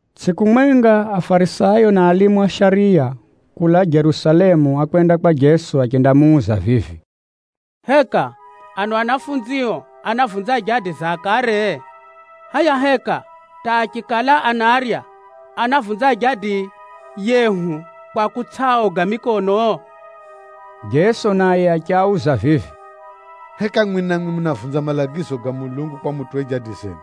Tsʼiku mwenga, Afarisayo na alimu a shariya kulaa Jerusalemu ákwenda kwa Jeso achendamuuza vivi, “Heka ano anafunzio anavunza jadi za akare? Hʼaya heka hata achikala anarya anavunza jadi yehu kwa kutsʼaoga mikono!?” Jeso naye achiauza vivi, “Heka mwimwi namwi munavunza malagizo ga Mulungu kwa mutuwe jadi zenu?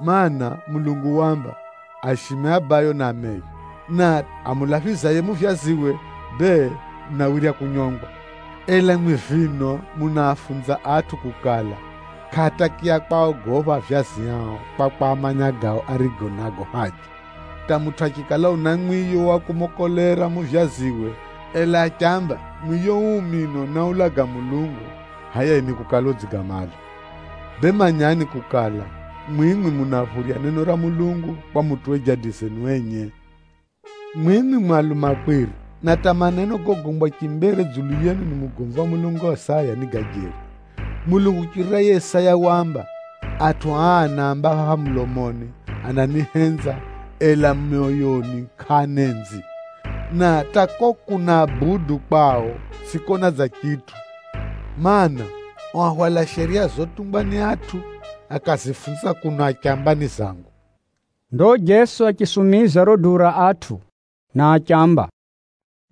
Maana, Mulungu waamba, ‘Aishime abayo na ameyo,’ na ‘Amulaphizaye muvyaziwe bee, unawirya kunyongwa.’ Ela mwimwi vino, munaafunza atʼu kukala, kʼaatakiya kwaogopha avyazi ao kwa kwamanya gao arigo nago haja, hata mutʼu achikala una mwiyo wa kumokolera muvyaziwe, ela achiamba, ‘Mwiyo uu mino náulaga kumupʼa Mulungu,’ hʼaya yiye ni kukala udzigamala. Bee manyani kukala, mwimwi munaphurya neno ra Mulungu kwa mutuwe jadi zenu enye. Mwimwi mu alumakwiri! Na hata maneno gogombwa chimbere dzulu yenu ni mugomvi wa Mulungu Isaya ni ga jeri. Mulungu kuchirira yiye Isaya waamba, ‘Atʼu aa anaamba mulomoni ananihenza, ela myoyoni kʼaanenzi. Na hata kuko kunabudu kwao, tsʼikona dza chitʼu. Mana, ao ahwala shariya zotungwa ni atʼu, akazifunza kuno achamba ni zangu!’” Ndo Jeso achisumiza riro duu ra atʼu, na achiamba,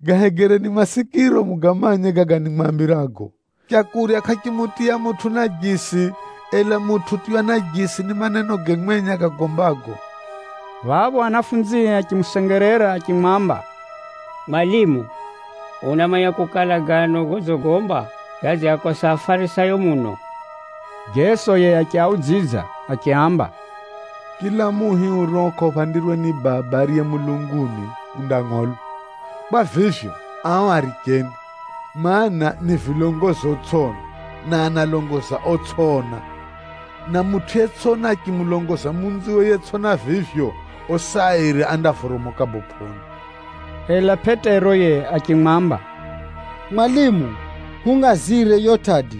“Gahegereni masikiro mugamanye gaga nimwambirago! Leu kʼarimutiya mutʼu najisi, ela mutʼu utiywa najisi ni manenoge mwenye agagombago.” Phapho anafunzie achimusengerera achimwamba, “Mwalimu, unamanya kukala gano godzigomba gadziakosa Afarisayo muno?” Jeso yiye achiaudzidza achiaamba, “Chila muhi urio kʼauphandirwe ni Baba ariye mulunguni, undangʼolwa. Kwa vivyo, ao aricheni, mana, ni vilongozi otsʼiona, na analongoza otsʼiona! Na mutʼu yetsʼona achimulongoza munziwe yetsʼona vivyo, osi airi andavoromoka bopʼoni.” Ela Pʼetero yiye achimwamba, “Mwalimu, hungʼazire yiyo tʼadi.”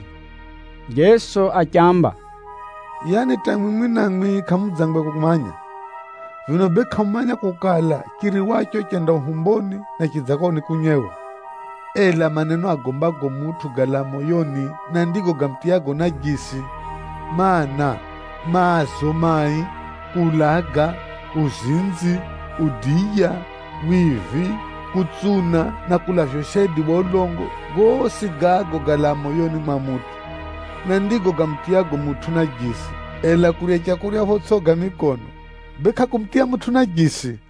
Jeso achiamba, “Yaani hata mwimwi namwi kʼamudzangwe kumanya? Vino bee kʼamumanya kukala, chiriwacho chenda uhumboni, na chidzako nikunyewa? Ela maneno agombago mutʼu galaa moyoni, na ndigo gamutiyago najisi. Mana, maazo mai, kuulaga, uzinzi, udiya, wivi, kutsuna na kulavya ushaidi wa ulongo, gosi gago galaa moyoni mwa mutʼu, na ndigo gamutiyago mutʼu najisi. Ela kurya leu photsʼi koga mikono, bee kʼakumutiya mutʼu najisi.”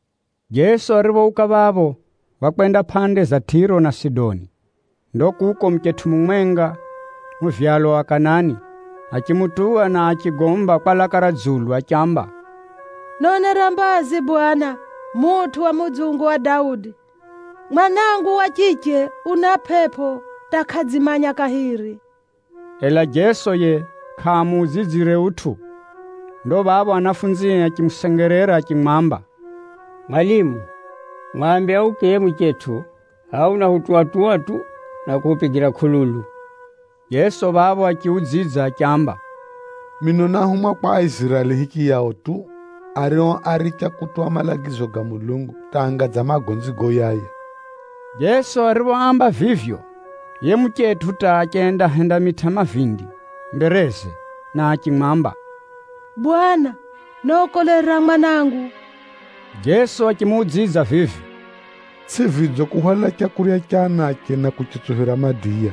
Jeso ariphouka phapho, wakwenda pʼande za Tʼiro na Sidoni. Ndo kuko muchetʼu mumwenga muvyalwa wa Kanani, achimutuwa na achigomba kwa laka ra dzulu achiamba, “Nonera mbazi Bwana, mutʼu wa mudzungu wa Daudi! Mwanangu wa chiche una pʼepʼo hata kʼadzimanya kahiri.” Ela Jeso yiye kʼamuudzidzire utʼu. Ndo phapho anafunzie achimusengerera achimwamba, “Mwalimu, mwambe auke yiye muchetʼu. Hʼaya unahutuwa-tuwa tu, na kuhupigira kʼululu.” Jeso phapho achiudzidza achiamba, “Mino náhumwa kwa Aiziraeli hichiyao tu, ario áricha kutuwa malagizo ga Mulungu hata anga dza magonzi goyaya.” Jeso ariphoamba vivyo, yiye muchetʼu hata achendahendamitʼa mavindi mbereze, na achimwamba, “Bwana, nokolera mwanangu!” Jeso achimuudzidza vivi, “Tsʼi vidzo kuhwala leu ra anache, na kuritsuphira madiya.”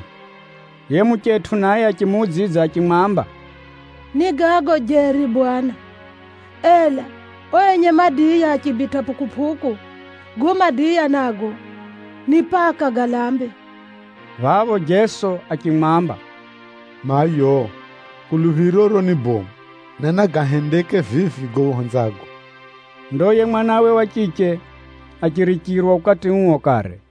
Yiye muchetʼu naye achimuudzidza achimwamba, “Ni gago jeri Bwana, ela ao enye madiya achibitʼa pʼukupʼuku, gago madiya nago ni paka galambe.” Phapho Jeso achimwamba, “Mayo, kuluphiroro ni bomu, na nagahendeke vivi gago uhenzago.” Ndo yiye mwanawe wa chiche achirichirwa ukati uo kare.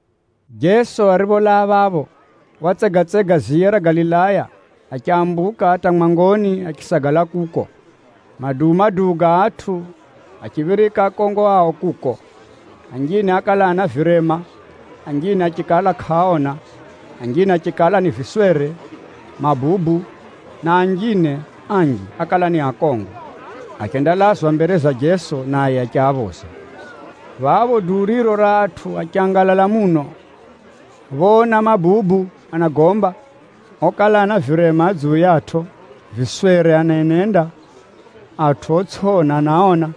Jeso aripholaa phapho, watsegatsega ziya ra Galilaya achambuka hata mwangoni achisagala kuko. Maduu-maduu ga atʼu achiphirika akongo ao kuko. Anjine ákala ana virema, anjine achikala kʼaaona, anjine achikala ni viswere, mabubu, na anjine anji okala ni akongo, achendalazwa mbere za Jeso, naye achiaphoza. Phapho duu riro ra atʼu achangalala muno, phoona mabubu anagomba, okala ana virema adzuyatʼo, viswere anenenda, atʼu otsʼiona anaona,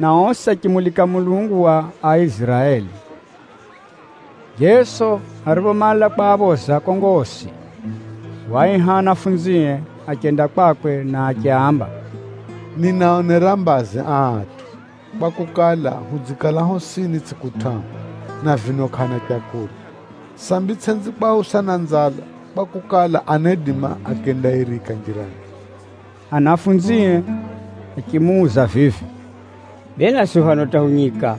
na osi achimulika Mulungu wa Aiziraeli. Jeso ariphomala kwaphoza akongo osi, waaiha anafunzie, achenda kwakwe na achiaamba, “Ninaaonera mbazi aa atʼu, kwakukala, hudzikala hosini tsʼiku tʼahu, na vino kʼaana leu. Sambi tsʼenzi kwausa na nzala, kwakukala, anaidima akendairika njirani.” Anafunzie achimuuza vivi, “Bee naswi phano hata hu nyika,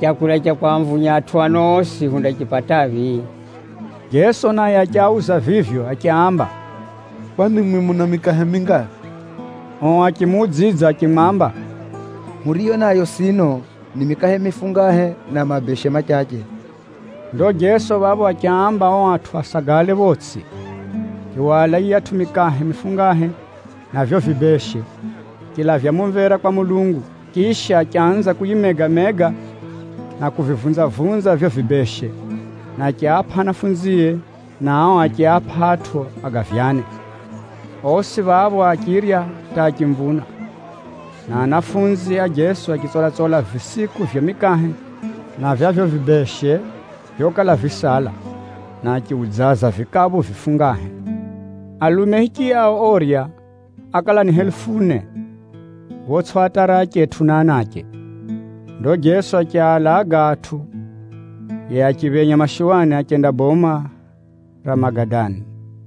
leu ra kwamvunya atʼu ano osi hundaripataphi?” Jeso naye achiauza vivyo achiaamba, “Kwani mwimwi muna mikahe mingaphi?” Ao achimuudzidza achimwamba, “Huriyo nayo sino, ni mikahe mifungahe na mabeshe machache.” Ndo Jeso phapho achiaamba ao atʼu asagale photsʼi. Achihwala yiyatʼu mikahe mifungahe na vivyo vibeshe, achilavya mumvera kwa Mulungu. Chisha, achanza kuyimega-mega na kuvivunza-vunza vivyo vibeshe, na achiapʼa anafunzie, na ao achiapʼa atʼu agavyane. Osi phapho achirya hata achimvuna. Na anafunzi a Jeso achitsola-tsola visiku vya mikahe na vya vivyo vibeshe vyokala visala, na achiudzaza vikaphu vifungahe. Alume hichiyao orya, ákala ni helufu ne photsʼiatara achetʼu na anache. Ndo Jeso achialaga atʼu, yiye achiphenya mashuwani achenda boma ra Magadani.